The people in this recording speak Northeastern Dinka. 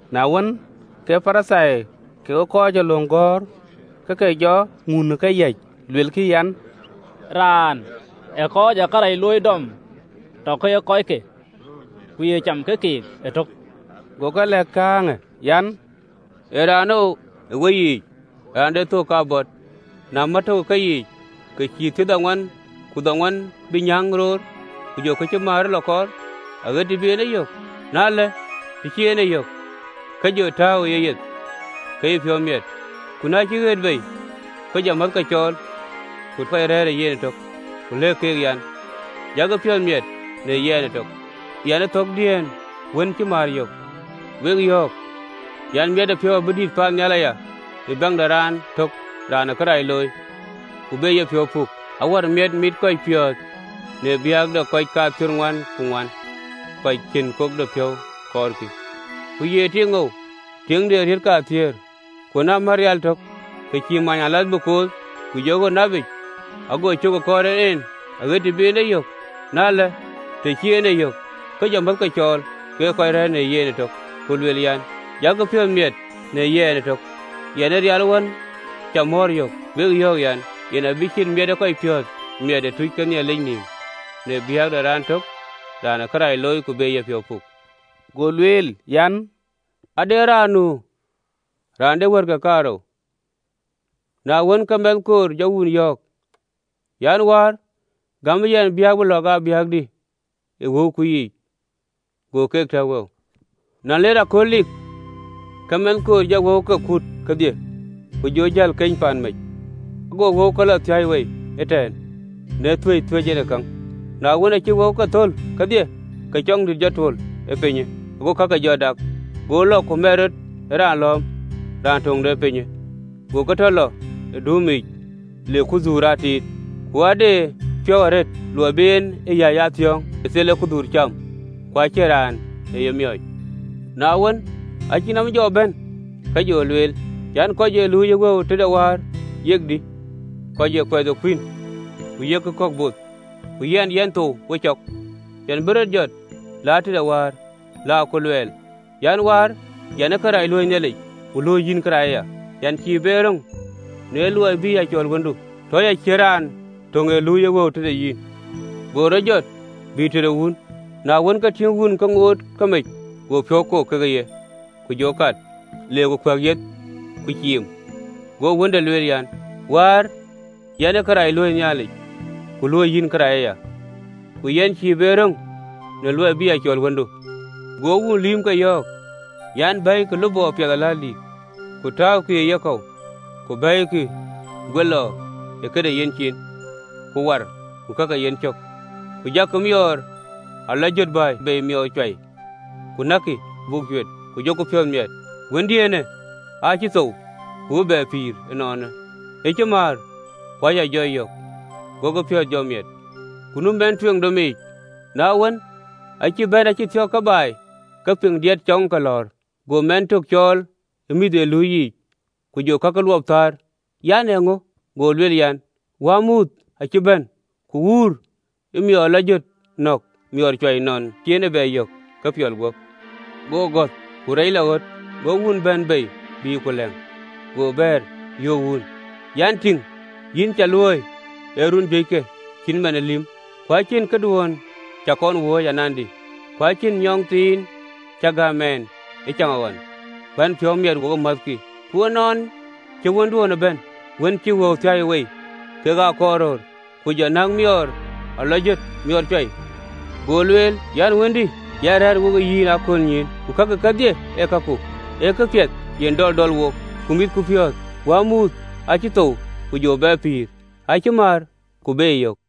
Na wën, ke Parithai kekë kɔc ee löŋ gɔ̈ɔ̈r ke ke jɔ ŋun ë këyäc, luelkï an, “Raanë ee kɔc ee kërac looi dɔm tɔ ke ye kɔcke, ku ye cam ke keek ëtök!” Go keek lɛ̈k kääŋë an, “Ee raanou ë weyiic, raan de thök kabɔt, na mär tök ë keyiic, ke cïï thiërdhoŋuan ku dhoŋuan bï nyääŋ roor, ku jɔ kë cï määrë lɔ kɔɔr, aɣet të bï e yök? Na ëlë, të cï en e yök, ke jɔ tääu ë yeyeth, ke cï piɔ̈u miɛt. Ku na cï ɣet bei, ke jɔ määthke cɔɔl ku kɔc rɛ̈ɛ̈r ë yen ëtök, ku lëk keek an, ‘Jakï piɔ̈ɔ̈th miɛt në yɛn ëtök, yɛn ë thɔ̈ɔ̈kdiën wën cï määr yök!’ Wek yɔ̈ɔ̈k an, miɛtëpiɔ̈u abï dït paannhial aya në biäk de raan tök raan ee kërac looi, ku be yepiɔ̈u puk, awär miɛt mitë kɔc piɔ̈ɔ̈th në biäk de kɔc kathiërdhoŋuan ku dhoŋuan kɔc cïn puŋdepiɔ̈u kɔɔrkï. “Ku ye tiiŋou, tiiŋ de atek kathiëër, ku na mɛ̈ɛ̈r ateŋ tök, ke cïï manyëalath bï kooth ku jɔ ɣöt napic, ago cök ë kɔɔr en en aɣët të bï en e yök? Na ëlë, të cï en e yök, ke jɔ määthke cɔɔl kekë kɔc rɛ̈ɛ̈r në yen ëtök, ku lueel an, ‘Jakï piɔ̈ɔ̈th miɛt në yɛn ëtök, yɛn ë rial wën cä mɔ̈ɔ̈r yök!’ Wek yɔ̈ɔ̈k an, “Yen abï ciët miɛt ee kɔc piɔ̈ɔ̈th miɛt ë tuuc ke Nhialic nïïm në biäk de raan tök raan ee kërac looi, ku be yepiɔ̈u puk.” Go lueel an, “Ade raan nu raan de wɛ̈ɛ̈tke kaarou. Na wën, ke mɛnh koor jɔ wun yɔ̈ɔ̈k an, ‘Wäär, gämë yɛn biäk bï lɔ̈ɔ̈k aa biäkdï ë wëuku yiic.’ Go keek tɛ̈k wëuke. Na leer akööl likë, ke mɛnh koor jɔ wëuke kut kedhie, ku jɔ jäl keny paan mec, go wëuke lɔ thiäi wei ëtɛ̈ɛ̈n në thuëëc thuëëc en ë käŋ. Na wën, aacï wëuke thöl kedhie, ke cɔŋdït jɔ tuöl ee pinyë, go kake jɔ dak. Go lɔ ku mɛt rɔt ë raan lɔ̈ɔ̈m raan töŋ de ee pinyë, go tɔ lɔ ë duumke yiic le kudhuur aa tiit. Ku aa de piɔ̈u arëët luɔi bï en e yäc aa thiɔ̈ɔ̈ŋ në thel ee kudhuur cam, ku acïn raan ee ye miɔɔc. Na wën, aacï nɔm jɔ bɛ̈n, ke jɔ lueel an, ‘Kɔc ee luui ë wëu tëde wäär yek dï, kɔc ee kuɛth ë kuïn ku yek kɔ̈k both, ku yɛn, yɛn thou we cɔk! Yɛn bï rɔt jɔt, la tëde wäär, la ku luɛɛl an, “Wäär, yɛn ë kërac luöi Nhialic, ku luöi yïn kërac aya. Yɛn cïï be röŋ në luɔi bï a cɔl wëndu: tɔ ya cït raan töŋ ee luui ë wëu tëde yïn.”’ Go rɔt jɔt, bï tëde wun. Na wën, ke tïŋ wun ke ŋoot ke mec, go piɔ̈u kok ke ye, ku jɔ kat, le ku kuɛk yeth, ku ciim. Go wënde lueel an, ‘Wäär, yɛn ë kërac luöi Nhialic, ku luöi yïn kërac aya, ku yɛn cïï be röŋ në luɔi bï a cɔl wëndu.’ Go wun lïïmke yɔ̈ɔ̈k an, ‘Bɛ̈ɛ̈ikï lupɔ piɛth aläldïïtë, ku tääukï ë yekɔ̈u, ku bɛ̈ɛ̈ikï guelɔ këde yenciin, ku war ka ke yencök. Ku jakï miɔɔr a lɔ jöt bɛ̈ɛ̈i bei miɔɔr cuai, ku näkkï, buk cuet, ku jɔku piɔ̈ɔ̈th miɛt! Wëndiënë aa cï thou, ku ë bɛ pïïr ënɔɔnë, aa cï määr, ku acï jɔ yök.’ Gokï piɔ̈ɔ̈th jɔ miɛt. Ku nu wën tueŋ domic. Na wën, aacï bɛ̈n, acï thiɔ̈k ke baai, ke piŋ diɛt cɔŋë ke lɔ̈ɔ̈r. Go mɛnh tök cɔɔl ë mïth ee luui yiic, ku jɔ kakë luɔp thar an, ‘Ee käŋö?’ Go lueel an, ‘Wänmuuth acï bɛ̈n, ku wuur ë miɔɔr a lɔ jöt nɔ̈k miɔɔr cuai, nɔn cï en e bɛ yök ke piɔl guöp.’ Go gɔ̈th, ku reec lɔ ɣöt, go wun bɛ̈n bei, bï ku lɛ̈ŋ. Go bɛ̈ɛ̈r, yöök wun, an, ‘Tïŋ, yïn cä luööi ë run juëckë cït man ë lïm, ku acïn këduön cä kɔn wööc anandï, ku acïn amɛthɔ̈k cï gäm ɛn ëcaŋɣɔn, bän piɔ̈u miɛt wokë määthkï. Ku ënɔn cï wënduönë bɛ̈në, wën cï wëuku thiäi wei kekë akɔɔrröör, ke jɔ näk miɔɔr a lɔ jöt, miɔɔr cuai.’ Go lueel an, ‘Wëndï, yïn rɛ̈ɛ̈r we yɛn ë aköölnyïïn, ku kakï kedhie ee kaku. Ee këpiɛth yen dɔl dɔl wok ku mitku piɔ̈ɔ̈th: wänmuuthë aacï thou, ku jɔ bɛ pïïr, aacï määr, ku beyë yök.”’